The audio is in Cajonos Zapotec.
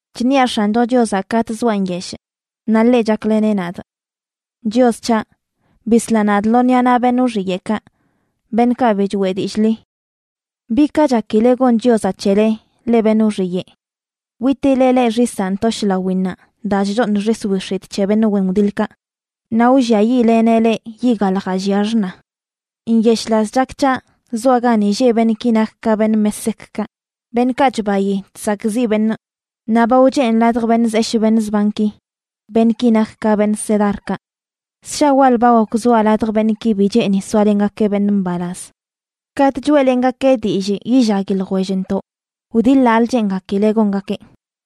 Chṉiaꞌ X̱ancho Chiozaꞌ katꞌ zoa nyeshꞌ, naꞌ ḻeꞌ chakleneꞌ nadꞌ. Chios c̱haꞌ, bisla nadꞌ lo ṉiꞌa naꞌ beṉꞌ wxiyeꞌkaꞌ, beṉꞌkaꞌ bi choꞌe dillꞌ ḻi. ¿Bi ka chakile gon Chiozaꞌ c̱hele, leꞌ beṉꞌ wxiyeꞌ? Witileꞌ leꞌ xisaꞌ ntoshꞌ lawinnaꞌ daa chchooṉ xis wix̱itꞌ c̱he beṉꞌ wen wdiḻkaꞌ, naꞌ wlliayiꞌleneꞌ leꞌ yiꞌ galjaꞌ llia xṉa. Nyeshꞌlaz chak c̱haꞌ zoaꞌ gani lleꞌ beṉꞌki nak ka beṉꞌ Meseckaꞌ, beṉꞌkaꞌ chbayi chsakꞌziꞌ beṉꞌ, naꞌ ba wchenꞌ ladj beṉꞌ zeshꞌ beṉꞌ zbanki, beṉꞌki nak ka beṉꞌ Cedarkaꞌ. Ssha wal ba gok zoaꞌ ladj beṉꞌki bi cheeni soalengakeꞌ beṉꞌ mbalaz. Katꞌ choeꞌlengakee dillꞌ yillagui ljwellntoꞌ, wdiḻaꞌlə cheengakileꞌ gongakeꞌ.